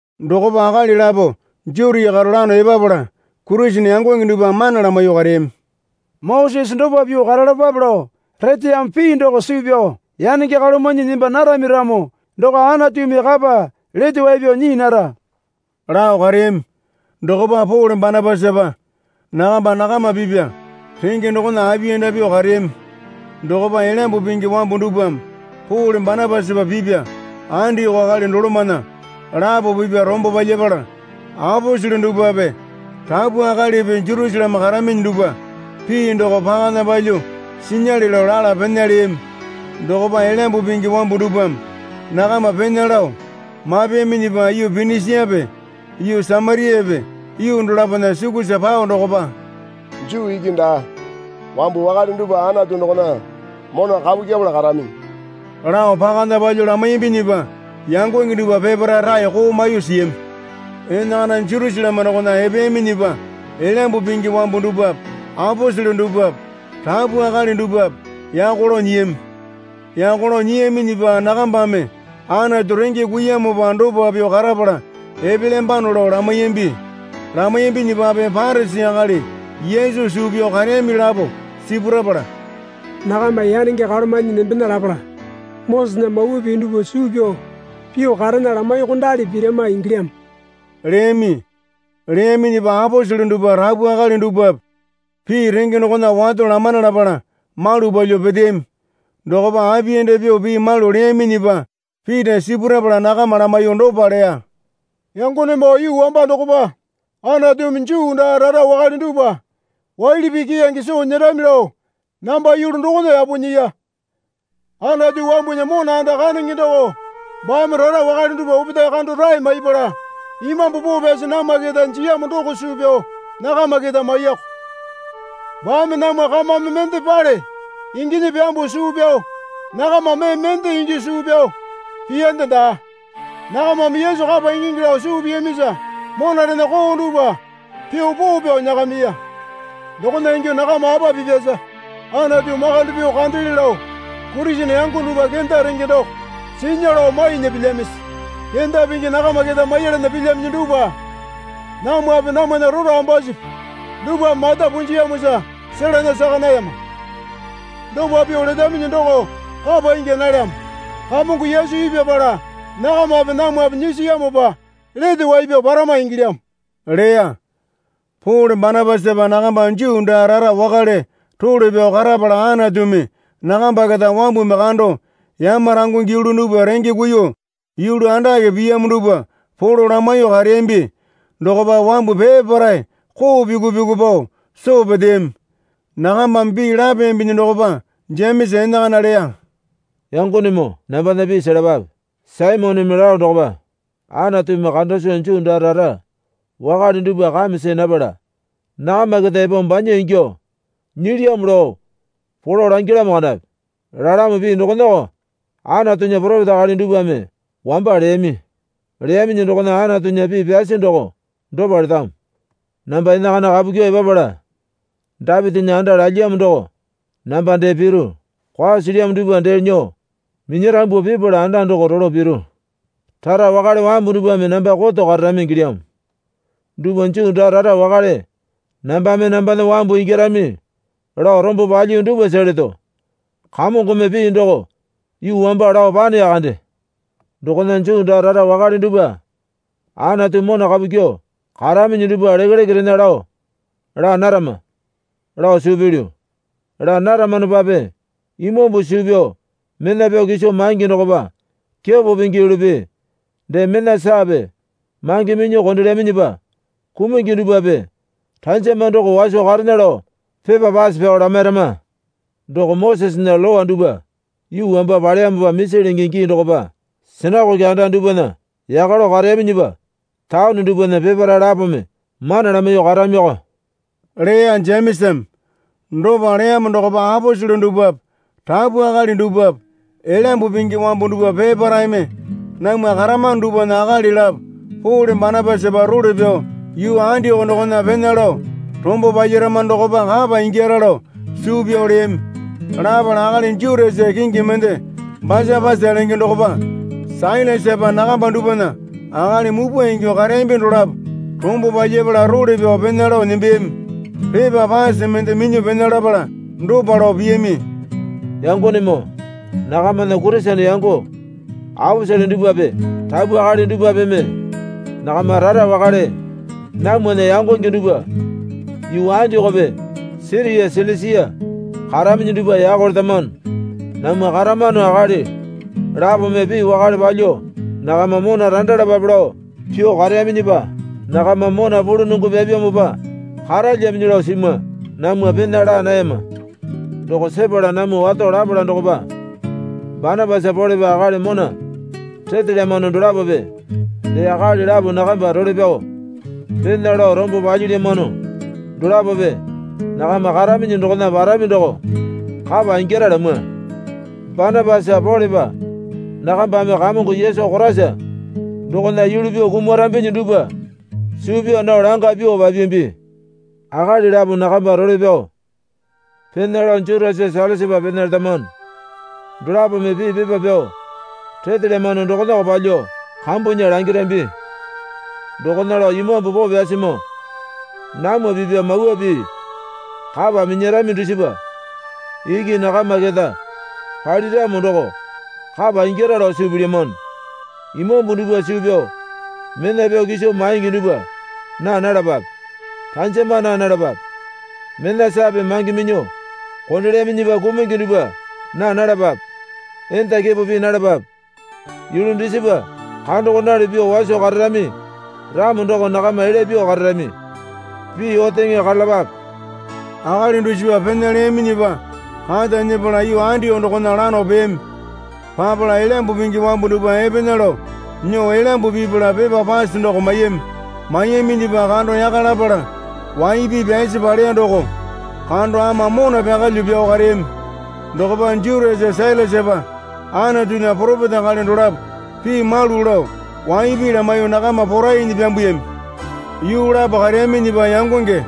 Dokopa akali lapo Jutia karo lano epapala Kurisene yangonge dupwa mana lamaiyuo kareyami. Mosese dopa pyuo karalapape lao reteyamo pii doko suu pyao yanenge kalomanyi nemba narami ramo doko Anatumi kapa lete wai pyao nyii nara lao kareyami. Dokopa Pole Banapasapa nakamba nakama pipya renge dokona apiyanda pyuo kareyami. Dokopa Elyambu Pingi wambu dupwame Pole Banapasapa pipya Andioko akali dolomana lapo pipya rombo palyapala aposele dupwape rapu akalipi Jerusaleme karaminyi dupwa pii doko pakana palyuo sinyale lao lala pena leyami. Dokopa Elyambu Pingi wambu dupwame nakama pena lao mapeyaminyipa yuu Pinisiape yuu Samariape yuu dolapona sukusa pao dokopa, Juu iki daa wambu wakale dupwa Anatu dokona mona kapu kyepala karaminyi, lao pakana palyuo lamaiyambinyipa yangonge dupwa peparae raeko maiyuo siyami. Enakana Jerusaleme dokona epeyaminyipa Elyambu Pingi wambu dupwape aposele dupwape rapu akali dupwape yako lao nyiyami. Yako lao nyiyaminyipa nakambame Anatu renge kuiyamopa dopa pyuo karapala epelyambano lao lamaiyambi. Lamaiyambinyipape Parisi akali Yesu suu pyao kareyami lapo sipurapala, Nakama yanenge kalomanyi nembena lapala Mosesena Mawa Pii dupwa suu pyao pyuo karena lamaiyuokondali pirama ingyilyamo leyami. Leyaminyipa aposele dupwa rapu akali dupwape pii renge dokona wato lamana lapala malu palyuo peteyami. Dokopa apiyanda pyuo pii malu leyaminyipa Pita sipurapala nakama lamaiyuo dopa leya. Yangonemoo yuu wamba dokopa Anatumi Juu daa rara wakale dupwa waili pii keyange soo nyerami lao namba yulu dokona yapo nyiya. Anatu wambunya mona anda kandenge doko baame rara wakale dupwa opetae kando rae maipala Imambu Poo Pyasi namwa keta jiyamo doko suu pyao nakama keta maiyako. Baame namwa kamame mendepale inginyi pyambuo suu pyao nakama mee mende ingyuo suu pyao piyande daa. Nakamame Yesu kapa ingingi lao suu piyamisa monarena koo dupwa pyuo poo pyao nyakamiya. Dokona ingyuo nakama apa pipyasa Anatu makande pyuo kandele lao Kurisene yango dupwa kenda renge doko sinya lao mainya pilyamisi? Kenda pingi nakama keta maiyalana pilyaminyi dupwa namwape namwana rora ambasupi dupwame mata punjiyamosa selana saka nayama. Dopa pyuo letaminyi doko kapa ingya nalyamo. Kamongo Yesu ipyapala nakamape namwape nyisiyamopa lete wai pyao parama ingilyamo leya. Pole Banapasapa nakamba Juu daa rara wakale role pyao karapala Anatumi nakamba keta wambumi kando yamarangungi yulu dupwa renge kuiyuo yulu andake piyamo dupwa polo lamaiyuo kareyambi dokopa wambu peparae koo pyuku pyuku pao soo peteyami. Nakambame pii lapeyambinyi dokopa Jemesa enakana leya. Yangonemoo, nambana pii selapape. Saimoneme lao dokopa Anatumi kanda soo Juu daa rara wakale dupwa kame see napala nakama keta epo banya ingyuo nyilyamo lao polo langyalamo kandapi. Lalamo pii dokonako Anatunya poropeta akali dupwame wamba leyami. Leyaminyi dokona Anatunya pii pyasi doko dopa letamo. Namba enakana kapu kyuo epapala Dapitinya anda lalyiyamo doko namba dee piru. Kwao silyamo dupwa dee nyuo minyarambuo pipala anda doko rolo piru. Rara wakale wambu dupwame namba koto kararami ingilyamo. Dupwa Juu daa rara wakale nambame nambana wambu ingyarami lao rombo palyiyu dupwasa leto. Kamongome pii doko yuu wamba lao paneya kande. Dokona Juu daa rara wakale dupwa Anatu mona kapu kyuo karaminyi dupwa lekeleke rena lao laa narama, lao suu pilyu. Laa naramanopape imambu suu pyao mena pyao kiso maingi dokopa kepo pingi yulupi dee mena saape mange minyuo kondelyaminyipa kumungi dupwape ranjama doko waso karena lao pepa pase pyao lamairama. Doko Mosesena Lowa dupwa yuu wamba paleyamopa misi lenge gii dokopa sinakoke anda dupwana yaka lao kareyaminyipa taone dupwana peparae lapome mana lamaiyuo karamiko leya Jemesame. Dopa leyamo dokopa aposele dupwape rapu akali dupwape Elyambu Pingi wambu dupwa peparaepeme namwa karamano dupwana akali lapo Pole Banapasapa role pyao yuu Andioko dokona pena lao rombo palyaramano dokopa kapa ingyara lao suu pyao leyami. Lapala akali Jutasa kingi mende Basapasa lenge dokopa Sailasapa nakamba dupwana akali mupwa ingyuo kareyambi dolapo rombo palyapala role pyao pena lao nembeyami. Pepa pase mende minyuo pena lapala dopa lao piyami. Yangonemoo, nakamana Kurisene yango aposele dupwape rapu akali dupwapeme nakama rara wakale namwana yangonge dupwa yuu Andiokope Siria Silisia karaminyi dupwa yako letamano. Namwa karamano akali lapome pii wakale palyuo nakama mona randalapape lao pyuo kareyaminyipa nakama mona pulunongo pyapyamopa karalyaminyi lao simwa. Namwa pena laa nayama. Doko sepala namwa wato lapala dokopa Banapasa Polepa akali mona retelyamano dolapope dee akali lapo nakamba role pyao pena lao rombo palyilyamano dolapope nakama karaminyi dokona parami doko kapa ingyara lamwa. Banapasa Polepa nakambame Kamongo Yesu Koraisa dokona yulu pyuo kumarambinyi dupwa suu pyaa nao langa pyuo papiyambi. Akali lapo nakamba role pyao pena lao Jutasa Sailasapa pena letamano. Dolapome pii pepa pyao retelyamano dokonako palyuo kambunya langirambi. Dokona lao Imambu Poo Pyasimoo namwa pipya mawa pii kapa minyarami dusipa iki nakama keta paliramo doko kapa ingyara lao suu pilyamano. Imambu dupwa suu pyao mena pyao kiso maingi dupwa naa nalapape. Ranjama naa nalapape. Mena saape mange minyuo kondelyaminyipa kumungi dupwa naa nalapape. Enda kepo pii nalapape. Yulu dusipa kandokondali pyuo waso kararami ramo doko nakama elya pyuo kararami. Pii oteŋe karalapape. Akali dusipa pena leyaminyipa kata nyepala yuu Andioko dokona lano peyami. Papala Elyambu Pingi wambu dupwa epena lao nyuo elyambu pipala pepa pase doko maiyami. Maiyaminyipa kando yaka lapala wai pii pyasi paleya doko kando ama mona pyakalyuo pyao kareyami. Dokopa Jutasa Sailasapa Anatunya poropeta akali dolapo pii malu lao waipi lamaiyuo nakama porainyi pyambuyami. Yuu lapo kareyaminyipa yangonge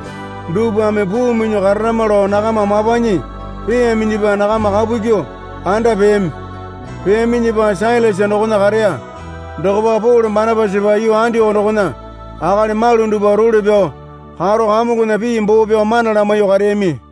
dupwame puu minyuo karamana lao nakama mapanyi peeyaminyipa nakama kapu kyuo anda peyami. Peyaminyipa Sailasa dokona kareya. Dokopa Pole Banapasapa yuu Andioko dokona akali malu dupwa role pyao karo Kamongona pii boo pyao mana lamaiyuo kareyami.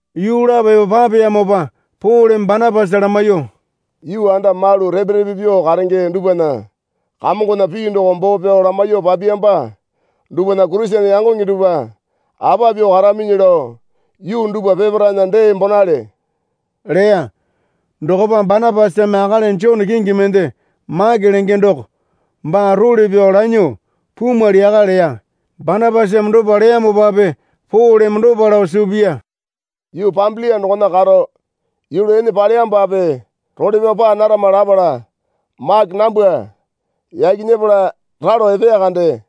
Yuu lapo epo papeyamopa Poleme Banapasa lamaiyuo, Yuu anda malu repe repe pyuo karenge dupwana Kamongona pii doko boo pyao lamaiyuo papiyamba dupwana Kurisene yangonge dupwa apa pyuo karaminyi lao yuu dupwa peparaena dee bonale, leya. Dokopa Banapasame akali Jone kingi mende Make lenge doko baa role pyao lanyuo pumwali yaka leya. Banapasame dopa leyamopape Poleme dopa lao suu piya. Yuu Pambilia dokona karo yulu ene paleyamopape role pyao paa narama lapala Make nambwa yaki nyepala ralo epeya kande.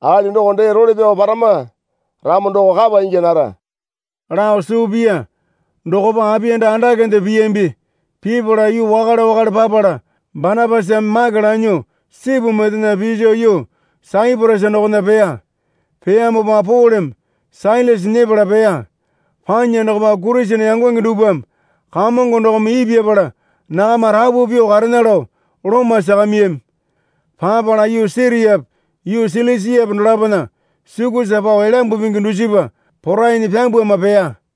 Akali doko dee role pyao parama ramo doko kapa ingya nara lao suu piya. Dokopa apiyanda andakende piyambi. Pipala yuu wakale wakale papala Banapasame Make lanyuo sipu mendena piso yuu Saiporasa dokona peya. Peyamopa Poleme Sailasa nyepala peya. Panya dokopa Kurisene yangonge dupwame Kamongo dokome ipyapala nakama rapu karena lao loma sakamiyami. Papala yuu Siriape yuu Silisiape dolapona sukusa pao Elyambu Pingi dusipa porainyi pyambwama peya.